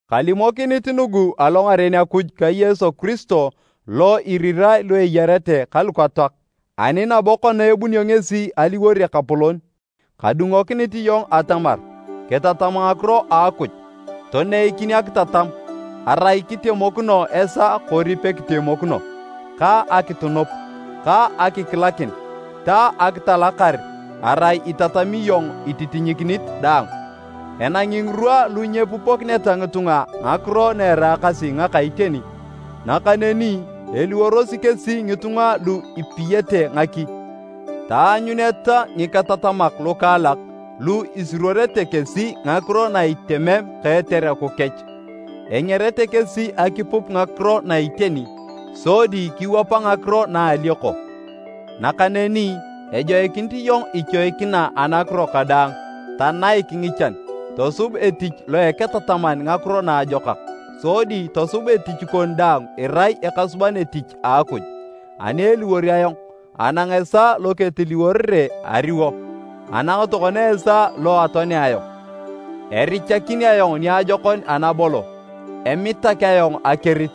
Kalimokinit nugu alongaren Akuj ka Yesu Kiristo lo irirae lu eyarete ka lukatoak, ani nabo kona ebunio ngesi aliwor Ekapolon, kadungokinit iyong atamar kitatam ngakiro a Akuj. Toneikin akitatam (arai kitemokino esaa kori pekitemokino), ka akitunup, ka akikilakin ta akitalakar arai itatami iyong ititinyikinit daang. Enangi ngirwa lu nyepupokineta ngitunga ngakiro na eraakasi ngaka iteni, nakaneni eliworosi kesi ngitunga lu ipiyete ngaki, taanyuneta ngiketatamak lukaalak lu isuruorete kesi ngakiro na itemem ka etereku kech. Engerete kesi akipup ngakiro na iteni sodi kiwapa ngakiro na alioko. Nakaneni ejoikinit iyong ichoikina anakiro kadaang, tanaik ngichan, tosub etich loa eketataman Ngakiro Naajokak, sodi tosub etich kon daang irai ekasuban etich a Akuj. Ani eliwor ayong, anang esaa lo ketiliworere ariwo, anang tokona esaa lo atoanea ayong. Erichakin ayong niajokon anabolo, emitak ayong akerit,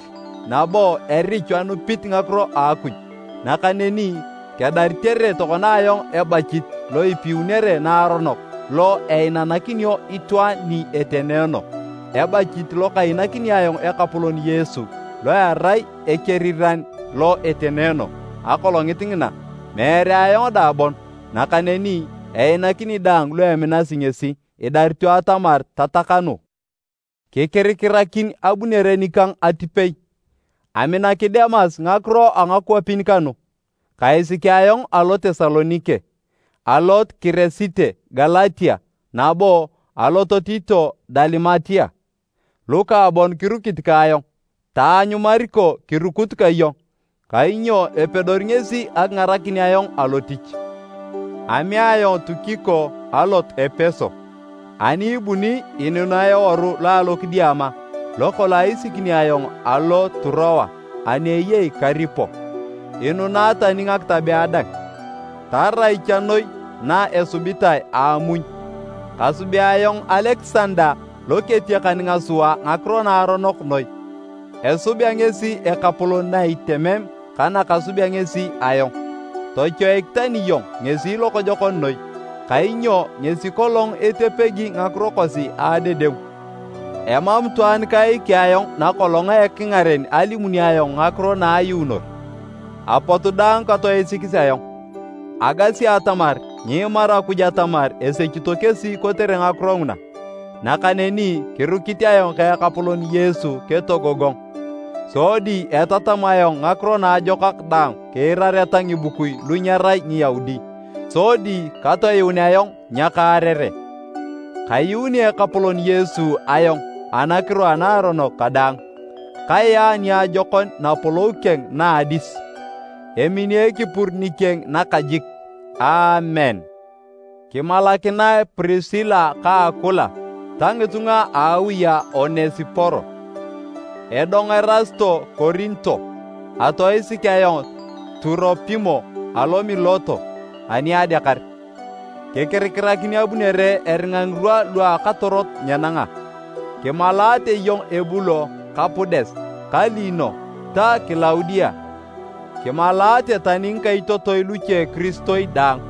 nabo erichu anupit ngakiro a Akuj. Nakaneni kedaritere tokona ayong ebachit lo ipiunere naaronok lo einanakinio itwaan ni etenoono, ebachit lo kainakini ayong Ekapolon Yesu lo erai Ekeriran lo etenoono, Akolongit ngina, meere ayong dang bon, nakaneni einakini daang lu eminasi ngesi, idarito atamar tatakanu. Kikirikirakin abunere nikang atipei. Aminaki Demas ngakiro a ngakwapin kanu kaisiki ayong alo Tesalonike. Alot Kiresite Galatia nabo alot Tito Dalimatia. Luka bon kirukit ka ayong. Taanyu Mariko kirukut ka iyong, kainyo epedori ngesi akingarakin ayong alotich. Amea ayong Tukiko alot Epeso. Ani ibuni inunae eworu lo alokidiama lokolong aisikini ayong alo Turoa ani eyei Karipo, inunae tani ngakitabea dang, tarai cha noi na esubitae a amuny. Kasubea ayong Alekisanda loketiakan ngasua ngakiro naaronok noi, esubea ngesi Ekapolon na itemem ka nakasubea ngesi ayong. Tochoik tani iyong ngesi lokojokon noi, kainyo ngesi kolong etepegi ngakiro kosi a adedengu. Emam itwaan kaiki ayong nakolong a ekingaren alimunio ayong ngakiro na ayuunor, apot daang katoisikis ayong. Agasi atamar nyiimaru Akuj atamar esechito kesi kotere ngakiro nguna! Nakaneni kirukit ayong ka Ekapolon Yesu ketogogong, sodi etatam ayong Ngakiro Naajokak daang kiirareta ngibukui lu nyerai Ngiyaudi, sodi katoyuun ayong nyakaarere. Kayuuni Ekapolon Yesu ayong anakiro a naaronok kadaang, kayaa niajokon Napolou keng na a adis. Emini ekipur nikeng nakajik! Aamen. Kimalakinae Prisila ka Akula ta ngitunga a awi a Onesiporo. Edong Erasito Korinto, atoisik ayong Turopimo alo Mileto ani adeakar. Kikirikirakin abunere eringa ngirwa lu a akatorot nyenanga. Kimalaate iyong Ebulo ka Pudes ka Lino ta Kilaudia, kimalaate tani ngikaitotoi luche kiristoi daang.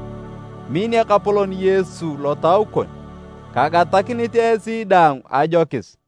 Min Ekapolon Yesu lotau kon. Kagatakinit esi daang ajokis.